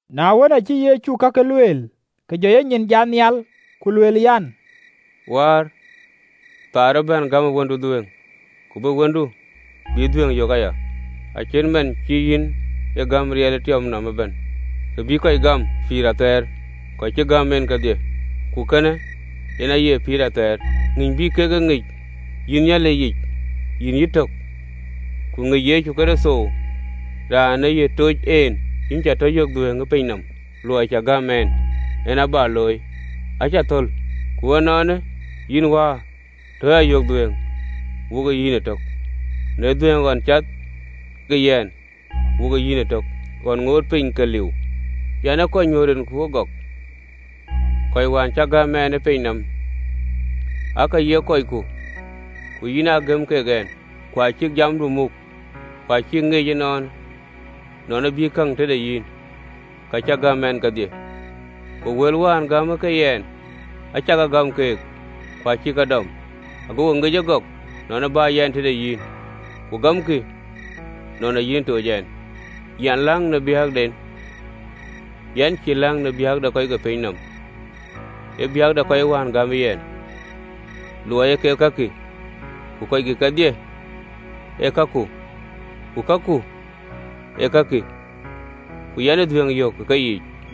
Na wën, acï Yecu kakë lueel, ke jɔ enyin jat nhial, ku lueel an, “Wäär, kööl acï bɛ̈n, gämë Wëndu dhuëëŋ, ke Wëndu bï yï tɔ yök dhuëëŋ aya. Acït man cï yïn e gäm riɛl ë tiɔp nɔm ëbɛ̈n, ke bï kɔc gäm pïïr athɛɛr, kɔc cï gäm en kedhie. Ku kënë yen aye pïïr athɛɛr an, Ŋïny bï kek yïn ŋic, yïn Nhialic yic, yïn yïtök, ku ŋickï Yecu Kërtho raan ë yïn ë toc en. Yïn cä tɔ yök dhuëëŋ ë piny nɔm, luɔi cï gäm ɛn, an, bä looi, acä thöl. Ku ënɔɔnë, yïn Wäär, tɔ ya yök dhuëëŋ wokë yïn ëtök, në dhuëëŋ ɣɔn cath ke yɛn wokë yïn ëtök ɣɔn ŋootë piny ke liu. Yɛn ë kɔc nyuöth rinku ëgɔk, kɔc wään cï gäm ɛn ë piny nɔm: aake ye kɔcku, ku yïn aa gëm ke yɛn, ku acïk jamdu muk, ku acïk ŋic ënɔɔnë nɔn ë bï käŋ tëde yïn, ka cï gäm ɛn kedhie. Ku wël wään gämë yɛn acä ke gäm keek, ku acïk ke dɔm, agokï ŋic ëgɔk nɔn ë bä yɛn tëde yïn, ku gamkï nɔn ee yïn ë toc ɛn. “Yɛn läŋ në biäkden: yɛn cïï läŋ në biäk de kɔc ke piny nɔm, ee biäk de kɔc wään gämë yɛn, luɔi ee kek kɔcku. Ku kakï kedhie ee kaku, ku kaku ee kakï: ku yɛn ee dhuëëŋ yök ë keyiic.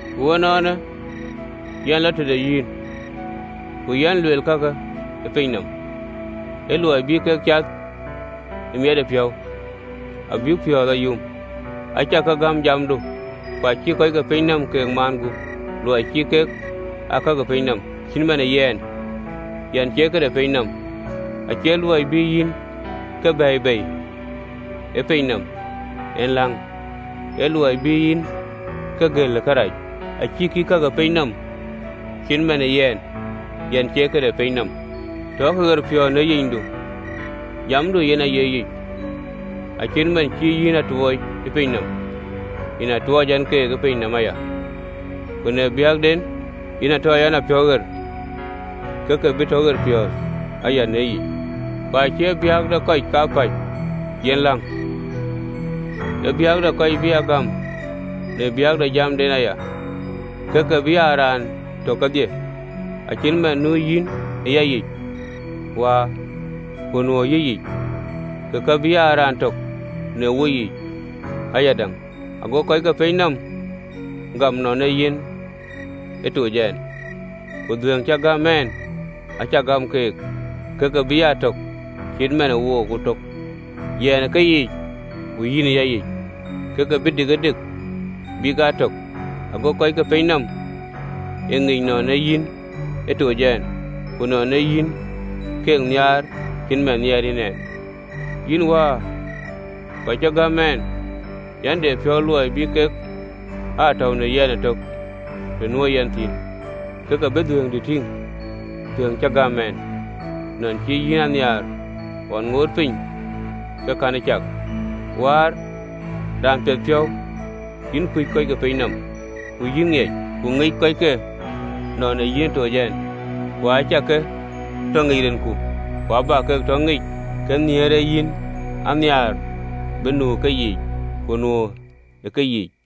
Ku ënɔɔnë, yɛn lɔ tëde yïn, ku yɛn luel kakë ë piny nɔm, ë luɔi bï kek cath ë miɛt de yɛnpiɔ̈u, abïk piɔ̈ɔ̈th a yum. Acä ke gäm jamdu, ku acï kɔc ke piny nɔm ke maan gup, luɔi cïï kek ee ka ke piny nɔm, cït man ë yɛn, yɛn cie këde piny nɔm. Acie luɔi bï yïn ke bɛ̈ɛ̈i bei ë piny nɔm en läŋ, ee luɔi bï yïn ke gël ë kërac. Acïkï ee ka ke piny nɔm, cït man ë yɛn, yɛn cie këde piny nɔm. Tɔ ke ɣerpiɔ̈ɔ̈th në yicdu: jamdu yen aye yic. Acït man cï yïn a tuɔɔc ë piny nɔm, yen aa tuɔɔc ɛn keek ë piny nɔm aya. Ku në biäkden yen a ta yɛn a piɔ̈u ɣer, ke ke bï tɔ ɣerpiɔ̈ɔ̈th aya në yic. “Ku acie biäk de kɔckë kapäc yen läŋ, ee biäk de kɔc bï a gam në biäk de jamden aya, ke ke bï aa raan tök kedhie, acït man nu yïn ë yayic, Wäär, ku nuö ë yïyic, ke ke bï aa raan tök në woyiic ayadäŋ: ago kɔc ke piny nɔm gam nɔn ee yïn ë toc ɛn. Ku dhuëëŋ cï gäm ɛn acä gäm keek, ke ke bï aa tök, cït man ee wok tök: yɛn ë keyiic, ku yïn ë yayic, ke ke bï dikëdik abïk aa tök, ago kɔc ke piny nɔm e ŋic nɔn ee yïn ë toc ɛn, ku nɔn cï yïn keek nhiaar, acït man nhiɛɛr yïn ɛn. “Yïn Wäär, kɔc cï gäm ɛn, yɛn de piɔ̈u luɔi bï kek aa tɔ̈u në yɛn ëtök të nuö yɛn thïn, ke ke bï dhuëëŋdï tïŋ, dhuëëŋ cï gäm ɛn, nɔn cï yïn a nhiaar ɣɔn ŋootë piny ke kënë cak. “Wäär, Raan piɛthpiɔ̈u, yïn kuc kɔc ke piny nɔm, ku yïn ŋiɛc, ku ŋic kɔckë nɔn ee yïn ë toc ɛn. Ku acä ke tɔ ŋic rinku, ku abä ke tɔ ŋic, ke nhiëër ee yïn a nhiaar bï nu ë keyiic, ku nuö ë keyiic.”